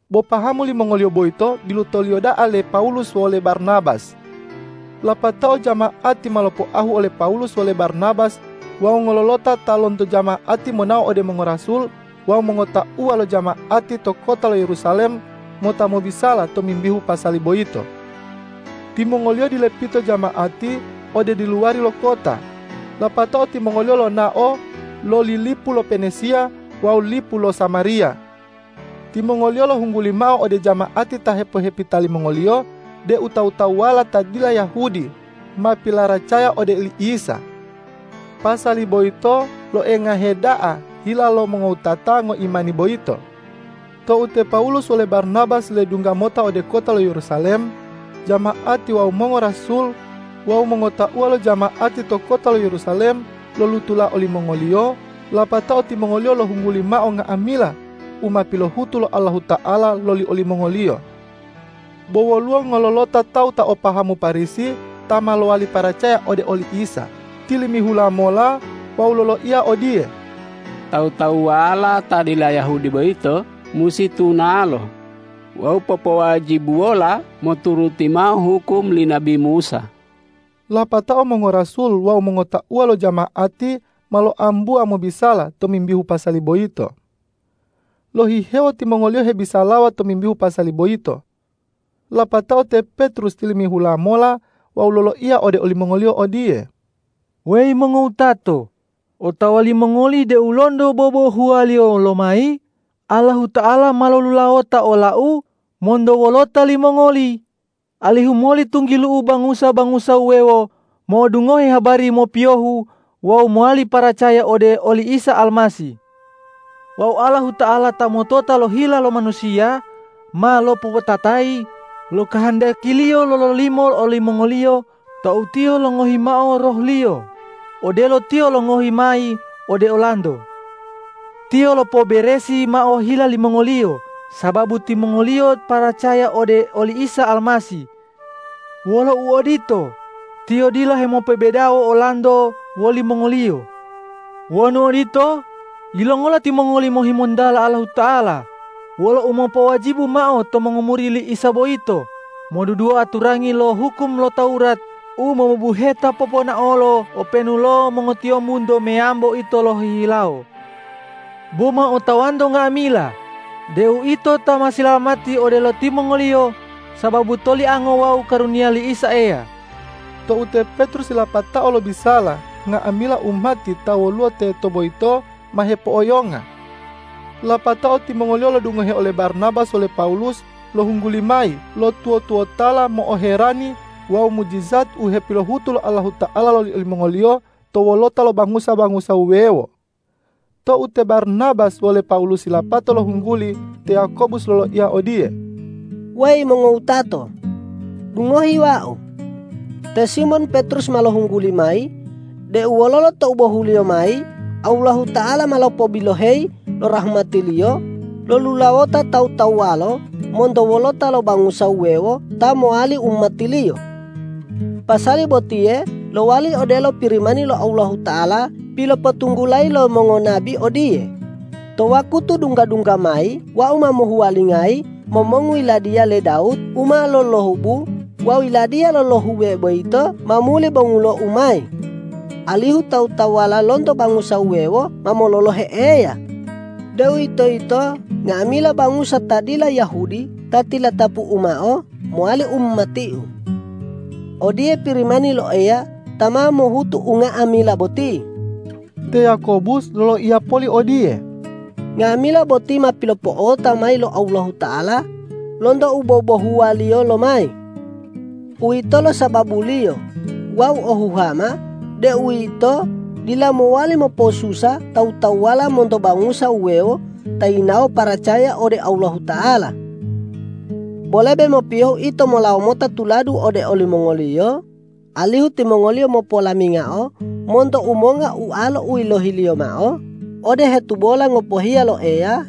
Bo pahamu limongoliyo boyito bilutoliyo da'a le Pawulus wole Barnabas. Lapatao jama'ati ma lopoahu ole Pawulus wole Barnabas wawu ngololota ta lonto jama'ati monao ode mongorasul wawu mongotauwa lo jama'ati to kota lo Yerusalem mota mobisala tomimbihu pasali boyito. Timongoliyo dilepito jama'ati ode diluwari lo kota, lapatao timongoliyo lonao loli lipu lo Penesiya wawu lipu lo Samariya. Timongoliyo lohungguli mao ode jama'ati ta hepohepita limongoliyo deu tawu-tawuwala ta dila Yahudi ma pilaracaya ode oli Isa. Pasali boyito loengahe da'a hila lo mongowutata ngoimani boyito. Tou te Pawulus wole Barnabas ledungga mota ode kota lo Yerusalem, jama'ati wawu mongorasul wawu mongotauwa lo jama'ati to kota lo Yerusalem lolutula olimongoliyo, lapatao timongoliyo lohungguli mao nga'amila u ma pilohutu lo Allahuta'ala loli olimongoliyo. Bo woluwo ngololota tawu ta o pahamu Parisi, ta ma lowali paracaya ode oli Isa, tilimihula mola wawu loloiya odiye,”Tawu-tawuwala ta dila Yahudi boyito musi tunalo wawu popowajibuwola moturuti mao hukum li nabi Musa.” Lapatao mongorasul wawu mongotauwa lo jama'ati ma loambuwa mobisala tomimbihu pasali boyito. Lohihewo timongoliyo hebisalawa tomimbihu pasali boyito. Lapatao te Petrus tilimihula mola wawu loloiya ode olimongoliyo odiye,”Weyi mongowutato, otawa limongoli deu lonto bobohuwaliyo lomayi Allahuta'ala ma lolulawota olau monto wolota limongoli, alihu moli tunggilu'u bangusa-bangusa wuwewo mo'odungohe habari mopiyohu wawu mowali paracaya ode oli Isa Almasih. Wawu Allahuta'ala ta motota lo hila lo manusiya ma lopopatatayi lo kahandaki-Liyo lololimo olimongoliyo tou Tiyo longohi mao Roh-Liyo, odelo Tiyo longohi mayi ode olanto. Tiyo lopoberesi mao hila limongoliyo sababu timongoliyo paracaya ode oli Isa Almasih. Wolo uodito, Tiyo dila hemopobedawo olanto wolimongoliyo. Wonu odito, yilongola timongoli mohimontala Allahuta'ala wolo umopowajibu mao to mongomuri li Isa boyito modudua aturangi lo hukum lo Tawurat u mobubuheta poponaolo openu lo mongotiyombunto meyambo ito lohihilawo? Bo ma otawanto nga'amila deu ito ma silalamati odelo timongoliyo sababu toliango wawu karuniya li Isa Eya.” Tou te Petrus yilapatao lobisala, nga'amila umati ta woluwo teto boyito ma hepo'oyonga. Lapatao timongoliyo lodungohe ole Barnabas wole Pawulus lohungguli mayi lo tuwo-tuwotala mo'oherani wawu mujijat u hepilohutu lo Allahuta'ala loli olimongoliyo to wolota lo bangusa-bangusa wuwewo. Tou te Barnabas wole Pawulus yilapato lohungguli, te Yakobus loloiya odiye,”Weyi mongowutato, dungohi wau! Te Simon Petrus ma lohungguli mayi deu wololo tou bohuliyo mayi Allahuta'ala ma lopobiloheyi lo rahmati-Liyo lolulawota tawu-tawuwala monto wolota lo bangusa wuwewo ta mowali umati-Liyo. Pasali botiye lowali odelo Pirimani lo Allahuta'ala pilopotunggulayi lo mongonabi odiye, ’To wakutu dungga-dungga mayi Wau ma mohuwalingayi momongu yiladiya le Dawud u ma lolohubu wawu yiladiya lolohube boyito ma muli bongulo-U mayi, alihu tawu-tawuwala lonto bangusa wuwewo ma mololohe Eya, deuwitoyito nga'amila bangusa ta dila Yahudi ta tilatapu-U mao mowali umati-U.’ Odiye Pirimani lo Eya ta ma mohutu unga'amila boti.” Te Yakobus loloiya poli odiye,”Nga'amila boti ma pilopo'ota mayi lo Allahuta'ala lonto u bobohuwaliyo lomayi. Uwitolo sababuliyo wau o huhama deu ito dila mowali mopo'osusa tawu-tawuwala monto bangusa wuwewo ta yinawo paracaya ode Allahuta'ala. Bo lebe mopiyohu ito molawo mota tuladu ode olimongoliyo, alihu timongoliyo mopolamingao monto umonga ualo u yilohiliyo mao ode u hetubola ngopohiya lo Eya,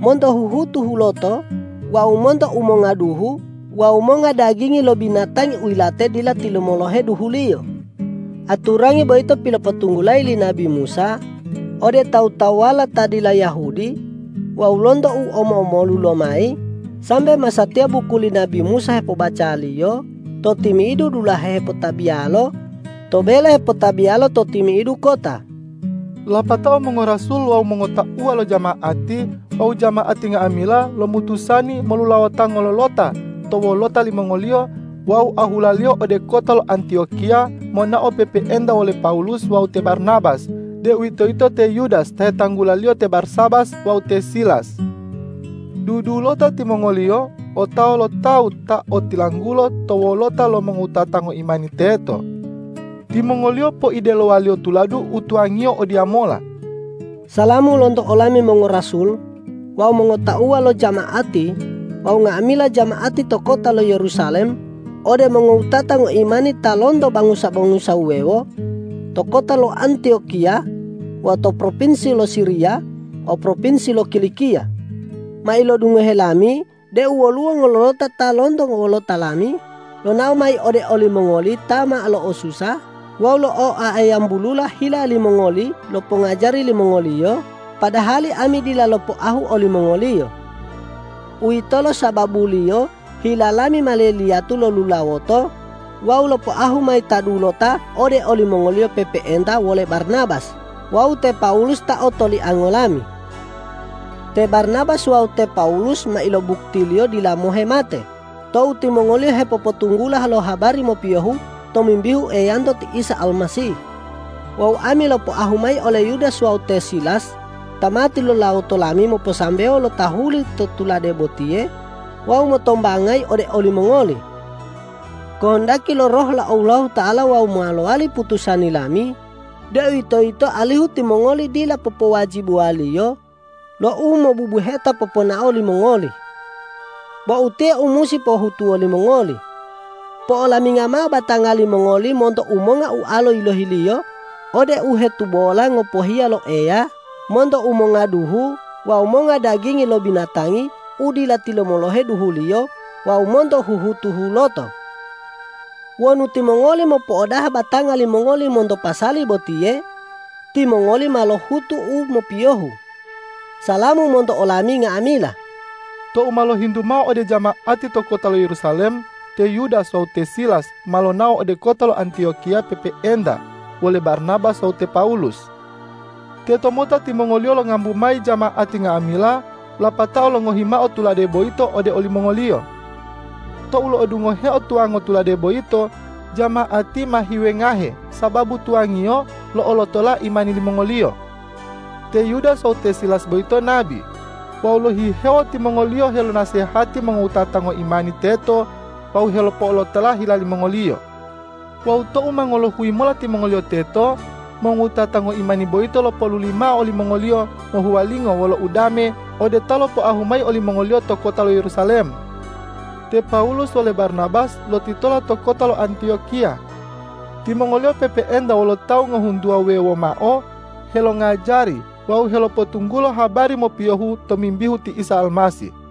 monto huhutu huloto wawu monto umonga duhu wawu monga dagingi lo binatangi u yilate dila tilumolohe duhuliyo. Aturangi boyito pilopotunggulayi li nabi Musa ode tawu-tawuwala ta dila Yahudi wawu lonto u omo-omolu lomayi sambe masatiya buku li nabi Musa hepobacaliyo to timi'idu dulahe hepotabiyalo to bele hepotabiyalo to timi'idu kota.” Lapatao mongorasul wawu mongotauwa lo jama'ati wawu jama'ati nga'amila lomutusani molulawota ngololota to wolota limongoliyo wawu ahulaliyo ode kota lo Antiyokiya monao pe'e-pe'enta wole Pawulus wawu te Barnabas, deuwitoyito te Yudas ta hetanggulaliyo te Barsabas wawu te Silas. Dudulota timongoliyo otawa lo tawu ta otilanggulo to wolota lo mongowutata ngoimani teto. Timongoliyo poidelowaliyo tuladu u tuwangiyo odiyamola,”Salamu lonto olami mongorasul wawu mongotauwa lo jama'ati wawu nga'amila jama'ati to kota lo Yerusalem ode mongowutata ngoimani ta lonto bangusa-bangusa wuwewo to kota lo Antiyokiya wawu to propinsi lo Siriya wawu propinsi lo Kilikiya. Ma ilodungohe lami deu woluwo ngololota ta lonto wolota lami lonao mayi ode olimongoli ta ma lo'osusa wawu lo'oayambulula hila limongoli lo pongajari limongoliyo, padahali ami dila lopoahu olimongoliyo. Uwitolo sababuliyo hila lami ma leliyatu lolulawoto wawu lopoahu mayi ta dulota ode olimongoli pe'epe'enta wole Barnabas wawu te Pawulus ta otoliango lami. Te Barnabas wawu te Pawulus ma ilobuktiliyo dila mohe mate tou timongoliyo hepopotunggula lo habari mopiyohu tomimbihu Eyanto ti Isa Almasih. Wawu ami lopoahu mayi ole Yudas wawu te Silas ta ma tilulawoto lami moposambewo lo tahuli to tulade botiye wawu motombangayi ode olimongoli. Kohondaki lo Roh lo Allahuta'ala wawu ma lowali putusani lami, deuwitoyito alihu timongoli dila popowajibuwaliyo lo u mobubuheta poponao limongoli. Bo utiye u musi pohutuwo limongoli: Po'olaminga mao batanga limongoli monto umonga ualo u yilohiliyo ode u hetubola ngopohiya lo Eya, monto umonga duhu, wawu monga dagingi lo binatangi u dila tilumolohe duhuliyo wawu monto huhutu huloto. Wonu timongoli mopo'odaha batanga limongoli monto pasali botiye, timongoli ma lohutu u mopiyohu. Salamu monto olami nga'amila!” Tou ma lohintu mao ode jama'ati to kota lo Yerusalem, te Yudas wawu te Silas ma lonao ode kota lo Antiyokiya pe'epe'enta wole Barnabas wawu te Pawulus. Tetomota timongoliyo longambu mayi jama'ati nga'amila lapatao longohi mao tulade boyito ode olimongoliyo. Tou lo'odungoheo tuwango tulade boyito, jama'ati ma hiwengahe sababu tuwangiyo lo'olotola imani limongoliyo. Te Yudas wawu te Silas boyito nabi. Wawu lohihewo timongoliyo helonasehati mongowutata ngoimani teto wawu helopo'olotola hila limongoliyo. Wawu tou ma ngolohuyi mola timongoliyo teto, mongowutata ngoimani boyito lopoluli mao olimongoliyo mohuwalingo wolo udame ode ta lopoahu mayi olimongoliyo to kota lo Yerusalem. Te Pawulus wole Barnabas lotitola to kota lo Antiyokiya. Timongoliyo pe'epe'enta wolo tawu ngohuntuwa wuwewo mao helongajari wawu helopotunggulo habari mopiyohu tomimbihu ti Isa Almasih.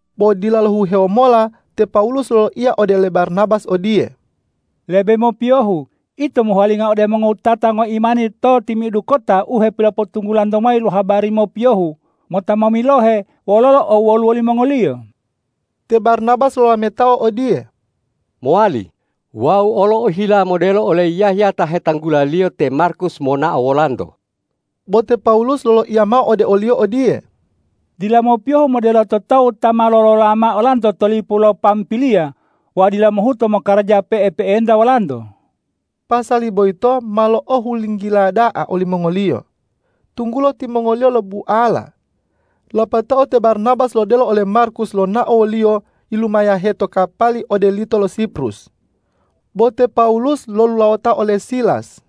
Bo dila lohihewo mola te Pawulus loloiya ode le Barnabas odiye,”Lebe mopiyohu ito mohuwalinga ode mongowutata ngoimani to timi'idu kota u hepilopotunggulanto mayi lo habari mopiyohu, mota momilohe wololo owwoluwo limongoliyo.” Te Barnabas lolametao odiye,”Mowali, wau olo ohila modelo ole Yahya ta hetanggulaliyo te Markus monao wolanto.” Bo te Pawulus loloiya mao ode oliyo odiye,”Dila mopiyohu modelo to tawu ta ma lolola mao olanto to lipu lo Pampiliya wawu dila mohuto mokaraja pe'ep'enta wolanto.” Pasali boyito ma lo'ohulinggila da'a olimongoliyo, tunggulo timongoliyo lobuala. Lapatao te Barnabas lodelo ole Markus lonao woliyo yilumayahe to kapali ode lito lo Siprus. Bo te Pawulus lolulawota ole Silas.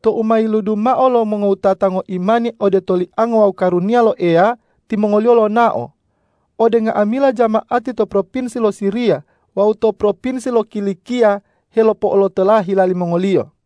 Tou ma yiludu mao lo mongowutata ngoimani ode toliango wawu karuniya lo Eya, timongoliyo lonao ode nga'amila jama'ati to propinsi lo Siriya wawu to propinsi lo Kilikiya helopo'olotola hila limongoliyo.